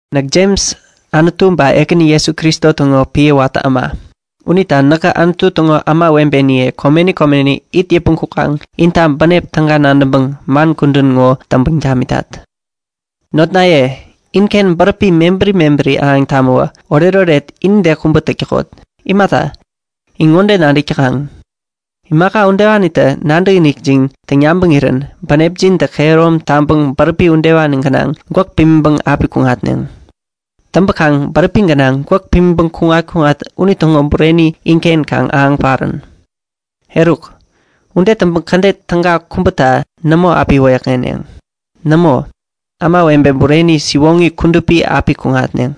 Näk Jems, Anutu ba Ekäni Jesu Kristo täŋo piä watä äma. Unita näkä Anutu täŋo kudupi ämawebeniye komeni komeni it yäpmäŋ kukaŋ inta bänep täga nadäŋpäŋ man kudän ŋo täŋpäŋ tamitat. Notnaye, inken bäräpi mebäri mebäri ahäŋ tamäwä oretoret inide kubä täk täkot. Imata, in ŋode nadäk täkaŋ; Imaka udewanitä nadäkinikjin täŋ yabäŋirän bänepjintä kehärom taŋpäŋ bäräpi udewani gänaŋ gwäk pimiŋpäŋ api kuŋatneŋ. Täŋpäkaŋ bäräpi gänaŋ gwäk pimiŋpäŋ kuŋat-kuŋat unitäŋo bureni inken kaŋ ahäŋ parän. Eruk, ude täŋpäŋ kädet täga kubäta nämo api wäyäkŋeneŋ. Nämo, ämawebe bureni, siwoŋi kudupi api kuŋatneŋ.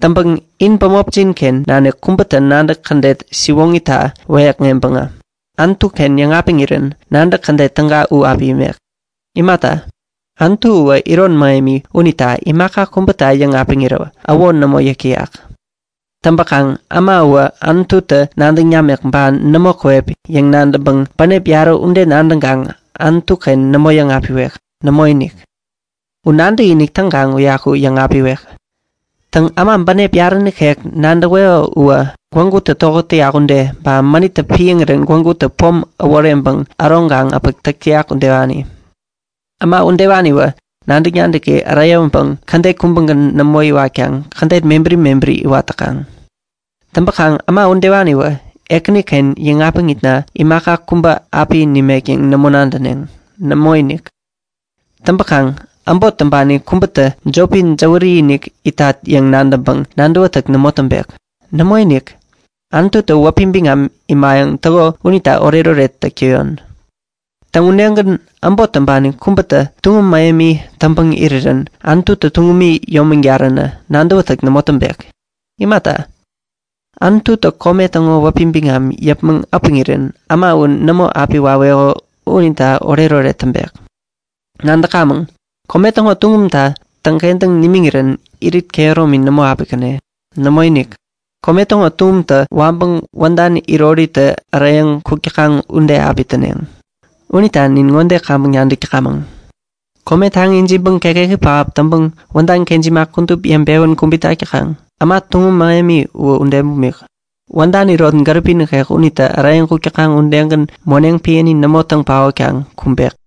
Täŋpäŋ in bämopjin-ken nanik kubätä nadäk kädet siwoŋita wäyäkŋeŋpäŋä Anutu-ken yäŋapiŋirän nadäk kädet täga u api imek. Imata, Anutu uwä iron mähemi unita imaka kubäta yäŋapiŋirä äwo nämo yäk täyak. Täŋpäkaŋ äma uwä Anututä nadäŋ namek ba nämo käwep yäŋ nadäŋpäŋ, bänep yarä ude nadäŋkaŋ Anutu-ken nämo yäŋapiwek. Nämoinik. U nadäkinik täŋkaŋ uyaku yäŋapiwek. Täŋ, äma bänep yarä nikek nadäweko uwä gwägutä tokät täyak ude, ba mänittä piäŋirän gwägutä pom äworeŋpäŋ äroŋkaŋ äpäk täyak udewani. Äma udewaniwä nadäk-nadäki äreyäwäpäŋ kädet kubägän nämo iwatkaŋ kädet mebäri mebäri iwat täkaŋ. Täŋpäkaŋ äma udewaniwä Ekäniken yäŋapiŋitna imaka kubä api nimek yäŋ nämo nadäneŋ. Nämoinik. Täŋpäkaŋ äbot täŋpani kubätä jopi jäwäri-inik itat yäŋ nadäŋpäŋ nadäwätäk nämo täŋpek. Nämoinik, Anututä wäpi biŋam imayäŋ täko unita oretoret täk täyon. Täŋ, udegän äbot täŋpani kubätä tuŋum mähemi täŋpäŋ irirän Anututä tuŋumi yomägaränä nadäwätäk nämo täŋpek. Imata, Anututä kome täŋo wäpi biŋam yäpmäŋ äpäŋirän äma u nämo api waweko unita oretoret täŋpek. Nadäkamäŋ; Kome täŋo tuŋumtä täŋkentäŋ nimiŋirän irit kehäromi nämo api käne. Nämoinik. Kome täŋo tuŋumtä waŋpäŋ wädan iroritä äreyäŋ kuk täkaŋ ude api täneŋ. Unita nin ŋode kaŋpäŋ nadäk täkamäŋ; Kome taŋi ijiŋpäŋ kekeki pähap täŋpäŋ wädan kejima kudup yeŋpewän kubit tak täkaŋ. Äma tuŋum mähemi uwä ude bumik. Wädan irot gäripi nikek unitä äreyäŋ kuk täkaŋ udegän moneŋ piäni nämo täŋ paotkaŋ kumbek.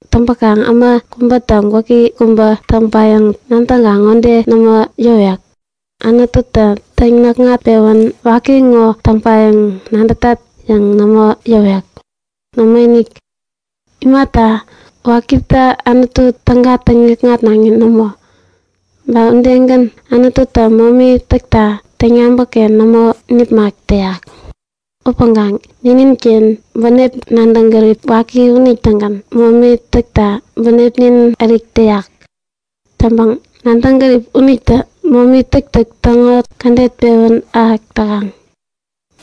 Täŋpäkaŋ äma kubätä waki kubä täŋpayäŋ nadäŋkaŋ ŋode nämo yäwek; Anututä täŋ-näkŋat-pewän waki ŋo täŋpayäŋ nadätat yäŋ nämo yäwek. Nämoinik! Imata, wakitä Anutu täga täŋikŋatnaŋi nämo. Ba udegän Anututä momi täkta täŋyabäk-ken nämo nipmak täyak. Upäŋkaŋ nininken bänep nadäŋ gärip waki unitägän momi täkta bänepnin ärik täyak. Täŋpäŋ nadäŋ gärip unitä momi täktäk täŋo kädet pewän ahäk täkaŋ.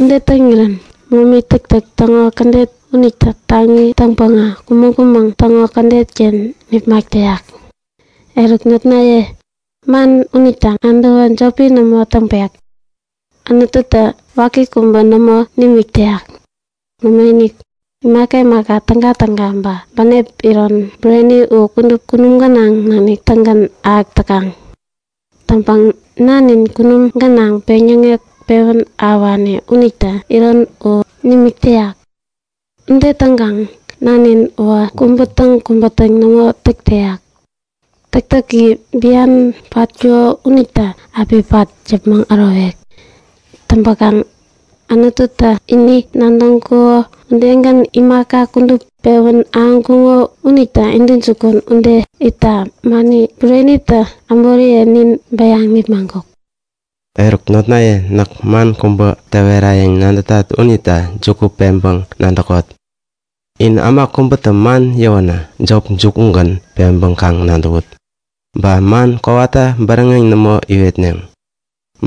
Ude täŋirän momi täktäk täŋo kädet unitä taŋi täŋpäŋä kumäŋ-kumäŋ täŋo kädet-ken nipmak täyak. Eruk, notnaye, man unita nadäwä jopi nämo täŋpek. Anututä waki kubä nämo nimik täyak. Nämoinik. Imaka imaka tägatäga ba bänep iron bureni u kudup kunum gänaŋ nanik-tägän ahäk täkaŋ. Täŋpäŋ Nanin, kunum gänaŋ peŋyäŋek pewän ahäwani unitä iron u nimik täyak. Ude täŋkaŋ Nanin uwä kubä-täŋ kubä-täŋ nämo täk täyak. Täktäki bian patkuko unitä api pat yäpmäŋ ärowek. Täŋpäkaŋ Anututä ini nadäŋkuko udegän imaka kudup pewän ahäŋkuŋo unita intäjukun ude itta mani burenitä äboriye nin bäyaŋ nipmaŋkuk. Eruk notnaye näk man kubä täwerayäŋ nadätat unita juku peŋpäŋ nadäkot. In äma kubätä man yäwänä jop jukugän peŋpäŋ kaŋ nadäwut. Ba man kowata bäräŋeŋ nämo iwetneŋ.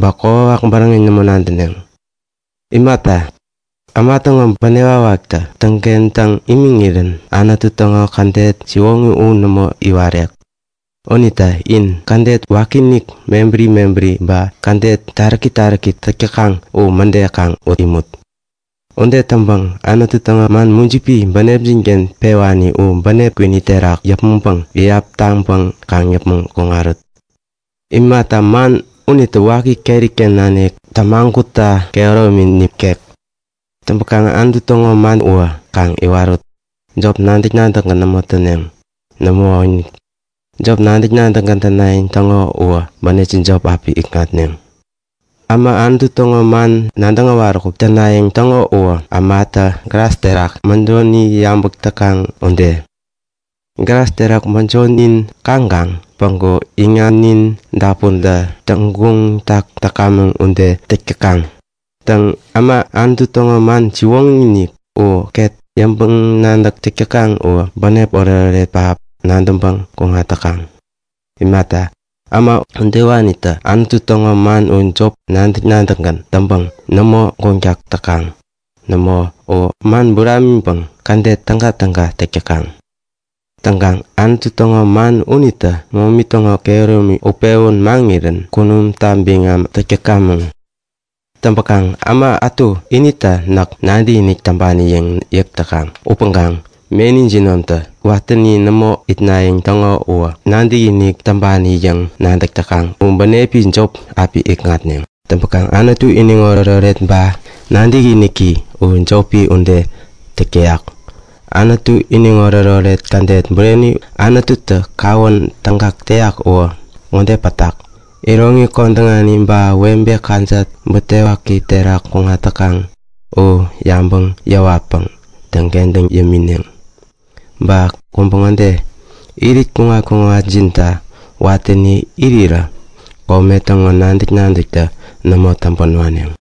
Ba kokwawak bäräŋeŋ nämo nadäneŋ. Imata, äma täŋo bänep wakwaktä täŋkentäŋ imiŋirän Anutu täŋo kädet siwoŋi u nämo iwarek. Unita in kädet wakiinik mebäri mebäri ba kädet taräki taräki täk täkaŋ u mäde kaŋ ut imut. Ude täŋpäŋ Anutu täŋo man mujipi bänepjin-ken piwani u bänep kwini terak yäpmäŋpäŋ iyap taŋpäŋ kaŋ yäpmäŋ kuŋarut. Imata, man unitä waki keri-ken nanik tämagutta kehäromini nikek. Täŋpäkaŋ Anutu täŋo man uwä kaŋ iwarut. Jop nadäk-nadäkgän nämo täneŋ. Nämoinik! Jop nadäk-nadäkgän tänayäŋ täŋo uwä bänepjin jop api ikŋatneŋ. Äma Anutu täŋo man nadäŋ äwaräkuk tänayäŋ täŋo uwä ämatä glas terak mäjoni yabäk täkaŋ ude. Glas terak mäjonin kaŋkaŋ päŋku iŋamnin dapunta täŋguŋtak täkamäŋ ude täk täkaŋ. Täŋ, äma Anutu täŋo man siwoŋi-inik u ket yäŋpäŋ-nadäk täk täkaŋ uwä Anutu täŋo bänep iron gänaŋ pen it täkaŋ. Imata, äma udewanitä Anutu täŋo man u jop nadäk-nadäkgän täŋpäŋ nämo guŋtak täkaŋ. Nämo, u man buramiŋpäŋ kädet tägatäga täk täkaŋ. Täŋpäkaŋ Anutu täŋo man unitä momi täŋo kehäromi utpewän maŋirän kunumta biŋam täk täkamäŋ. Täŋpäkaŋ äma ätu inita näk nadäkinik täŋpani yäŋ yäk täkaŋ upäŋkaŋ meni jinomta watäni nämo itnayäŋ täŋo uwä nadäkinik täŋpani yäŋ nadäk täkaŋ u bänepi jop api ikŋatneŋ. Täŋpäŋ Anutu iniŋoret-oret ba nadäkiniki u jopi ude täk täyak. Täŋ, Anutu iniŋoret-oret kädet bureni Anututä kawän tägak täyak uwä ŋode pätak; Iroŋi kodäŋani ba webe kajat butewaki terak kuŋat täkaŋ u yabäŋ yäwatpäŋ täŋkentäŋ yämineŋ. Ba kubä ŋode; Irit kuŋat-kuŋatjinta watäni irirä kome täŋo nadäk-nadäktä nämo täŋpän waneŋ.